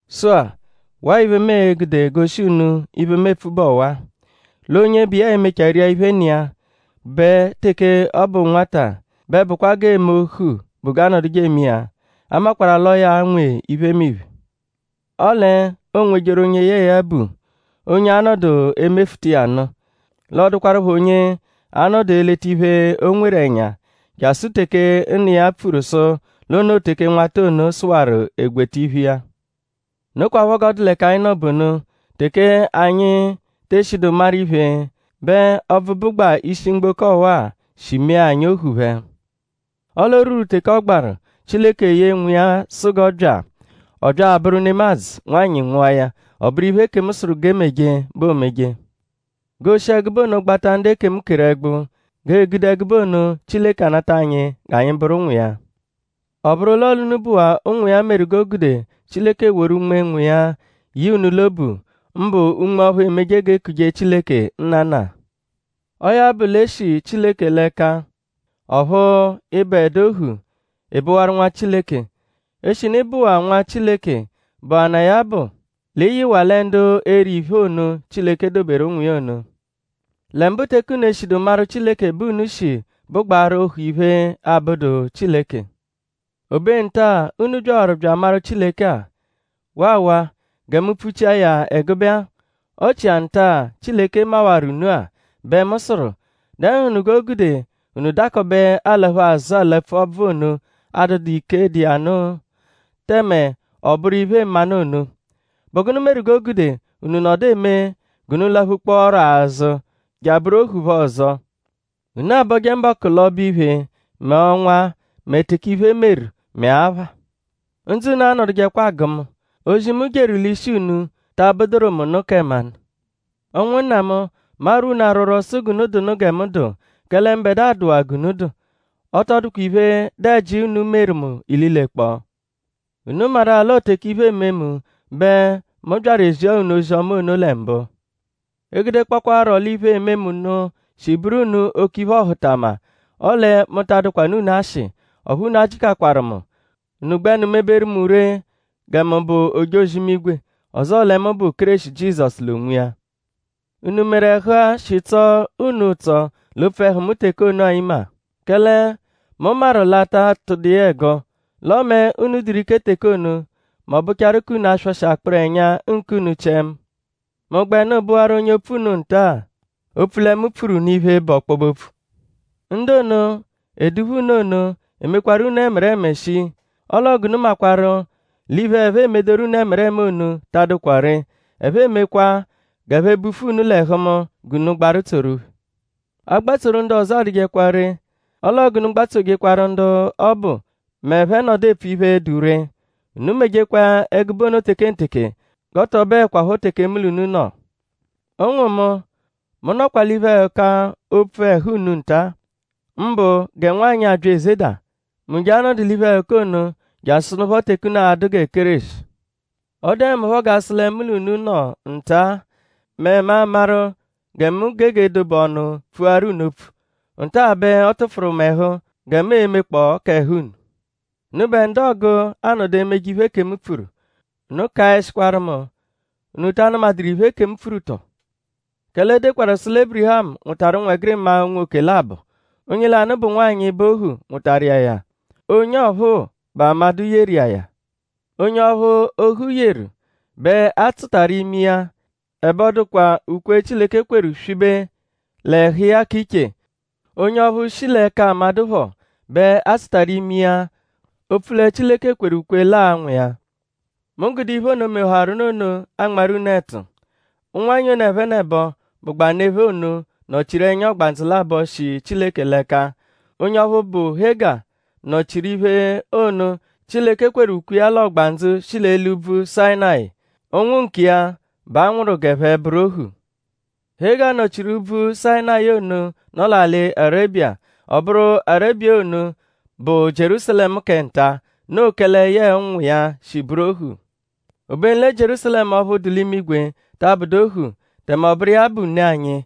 Sụ-a; waa iphe, mu e-gude goshi unu iphe, mu epfu bụ ọwa-a: l'onye bụ iya e-mechaa ria iphe nna iya; bẹ teke ọ bụ nwata bẹ bụkwa g'eeme ohu bụ g'aanọduje eme iya. A makwarụ-a l'ọo ya nwe iphemiphe; ọle oonwejeru onye yẹe ya bu; onye a-nọdu emefuta iya nụ; l'ọ dụkwarupho onye a-nọdu eleta iphe, o nweru ẹnya jasụ teke nna iya pfuru sụ l'o noo teke nwata ono sụwaru egweta iphe iya. Nokwaphọ g'ọ dụ l'ẹka anyi nọ bụ ono. Teke anyi te eshidu maru iphe bẹ ọbvu, bụgbaa ishi mgboko ọwa-a shi mee anyi ohu phẹ. Ọle o rwuru teke ọ gbaru; Chileke ye Nwa iya sụ g'ọ bya. Ọ bya abụru nemadzụ; nwanyị nwụa ya. Ọ bụru iphe, ekemu sụru g'e meje bẹ oomeje; g'oo-shi ẹgube ono gbata ndu ekemu keru ẹgbu; g'ee-gude ẹgube ono Chileke anata anyi g'anyi bụru ụnwu iya. Ọ bụru l'ọo l'unu bụwaa ụnwu iya meru g'o gude Chileke woru Unme Nwa iya ye unu l'obu; mbụ Unme ọphu emeje g'e kuje Chileke “Nnana!” Ọo ya bụ l'e shi Chileke l'ẹka; ọphu ị bụedu ohu; ị bụwaru nwa Chileke. Eshinu ị bụwaa nwa Chileke bụanaa ya-a bụ l'ị yịwaa lẹ ndu e-ri iphe ono, Chileke doberu ụnwu iya ono. Lẹ mbụ teke unu eshidu maru Chileke bẹ unu shi bụgbaaru ohu iphe, abụdu Chileke. Obe nta-a, unu byawaru bya amaru Chileke-a; waawaa; gẹ mu pfuchia ya ẹgube-a; ọ chia nta-a, Chileke mawaru unu-a; bẹ mu sụru:?Dẹnuhunu g'o gude unu dakọbe alaphu azụ alapfu ọbvu ono, adụdu ike dụ iya nụ; tẹme ọ bụru iphe-mmanụ ono??Bụ gụnu meru g'o gude unu nọdu eme g'unu laphukpọoro azụ je abụru ohu phẹ ọzo? Unu abọje mbọku l'ọbo-iphe; mẹ ọnwa; mẹ teke iphe meru; mẹ apha. Ndzụ unu anọdujekwa agụ mu.?Ozi, mu jeru l'ishi unu ta abụduru mu nụ kẹ mmanụ? Ụnwunna mu; mu arwọ unu arwọrwo; sụ g'unu dụnu gẹ mu dụ; kẹle mbẹdua dụwaa g'unu dụ. Ọ tọ dụkwa iphe, dụ ẹji, unu meru mu ililekpọo. Unu maru-a l'ọo teke iphe eme mu bẹ mu byaru ezia unu ozi-ọma ono lẹ mbụ. E -gudekpọkwaaro l'iphe, eme mu nụ shi bụru unu oke iphe-ọhutama; ọle mu ta adụkwanu unu ashị; ọphu unu ajịkakwaru mu. Unu gbẹnu meberu mu ree gẹ mu bụ ojozi-imigwe; ọzoo lẹ mu bụ Kéreshi Jizọsu l'onwiya. ?Unu meru ẹhu-a, shi tsọo unu ụtso l'opfu ẹhu mu teke ono-a imagha? Kẹle mu maru l'a ta tụdu iya ẹgo; l'ọme unu dụru ike teke ono mẹ ọ bụchaaru k'unu aswọshi akpụru ẹnya nkunu chiẹ mu. ?Mu gbẹnu bụwaru onye opfu unu nta-a; opfu lẹ mu pfuru unu iphe, bụ ọkpobe-opfu? Ndu ono, eduphu unu ono emekwaru unu ẹmereme shii; ọo l'ọo g'unu makwarụ l'iphe, ẹphe emedoru unu ẹmereme ono ta adụkwa ree. Ẹphe emekwa g'ẹphe bufu unu l'ẹhu mu g'unu gbaru tsoru phẹ. Agbatsoru ndu ọzo adụjekwa ree; ọo l'ọo g'unu gbatsojekwaru ndu ọbu m'ẹphe -nọdu epfu iphe, dụ ree. Unu mejekwa ẹgube ono tekenteke; g'ọ tọ bụekwapho teke mu l'unu nọ. Ụnwu mu! Mu nọkwa l'iphe-ẹhuka opfu ẹhu unu nta; mbụ gẹ nwanyị, abya ezeda. Mu je a-nọdu l'iphe-ẹhuka ono jasụnupho teke unu a-dụ gẹ Kéreshi. Ọ dụe mu phọ g'a sụ lẹ mu l'unu nọ nta-a; mẹ mu amaru gẹ mu gege dobe ọnu pfuaru unu opfu. Nta-a bẹ ọ tụfuru mu ẹhu gẹ mu e-mekpọo k'ẹhu unu. Unubẹ ndu ọogu anọdu emeje iphe, ekemu pfuru; unu kaẹshikwaru mu;?unu ta anụmaduru iphe ekemu pfuru tọ? Kẹle e dekwaru sụ lẹ Ébirihamu nwụtaru ụnwegirima unwoke labọ. Onye lanụ bụ nwanyị, bụ ohu nwụtaru iya ya; onye ọphuu bụ amadụ yeru iya ya. Onye ọphu, ohu yeru bẹ a tsụtaru ime iya ẹbe ọ dụdu ukwe Chileke kweru swibe l'ẹhu iya k'iche. Onye ọphuu, shi l'ẹka amadụ phọ bẹ a tsụtaru ime iya opfu lẹ Chileke kweru ukwe l'aa-nwụ iya. Mu gude iphe ono, mehawaru nụ ono anmarụ unu ẹtu. Ụnwanyi ono ẹphenebo, bụgbaa ne phẹ ono nọ-chiru ẹnya ọgbandzu labọ, shi Chileke l'ẹka. Onye ọphu, bụ Hega nọ-chiru iphe ono, Chileke kweru ukwe iya l'ọgbandzu shi l'eli úbvú Sayịnayi. Ụnwu nkiya bẹ a nwụru g'ẹphe bụru ohu. Hega nọ-chiru úbvú Sayịnayi ono nọ l'alị Arebiya. Ọ bụru Arebiya ono bụ Jierúsalẹmu kẹ nta-a. Noo kẹle yẹe ụnwu iya shi bụru ohu. Obenu lẹ Jierúsalẹmu ọphu dụ l'imigwe ta abụdu ohu; tẹme ọ bụru iya bụ ne anyi.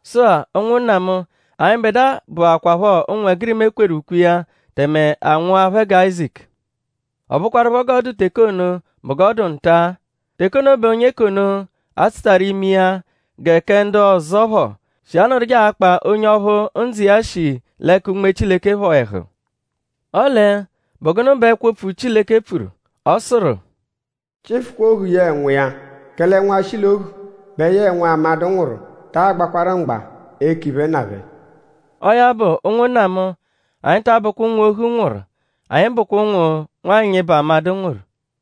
Sụ-a; ụnwunna mu; anyịbedua bụakwapho ụnwegirima e kweru ukwe iya tẹme a nwụa phẹ gẹ Áyizaku. Ọ bụkwarupho g'ọ dụ teke ono bụ g'ọ dụ nta-a. Teke ono bẹ onye k'ono, a tsụtaru ime iya gẹ kẹ ndu ọzo phọ shi anọduje akpa onye ọphu ndzụ iya shi l'ẹka Unme Chileke phọ ẹhu. Ọle?bụ gụnu bẹ ẹkwo-opfu Chileke pfuru? Ọ sụru: “Chịfukwa ohu yẹe nwa iya; kẹle nwa, shi l'ohu bẹ yẹe nwa, amadụ nwụru taa gbakwarụ mgba eke iphe nna phẹ.” Ọo ya bụ; ụnwunna mu; anyi ta abụkwa ụnwu, ohu nwụru; anyi bụkwa ụnwu, nwanyị bụ amadụ nwụru.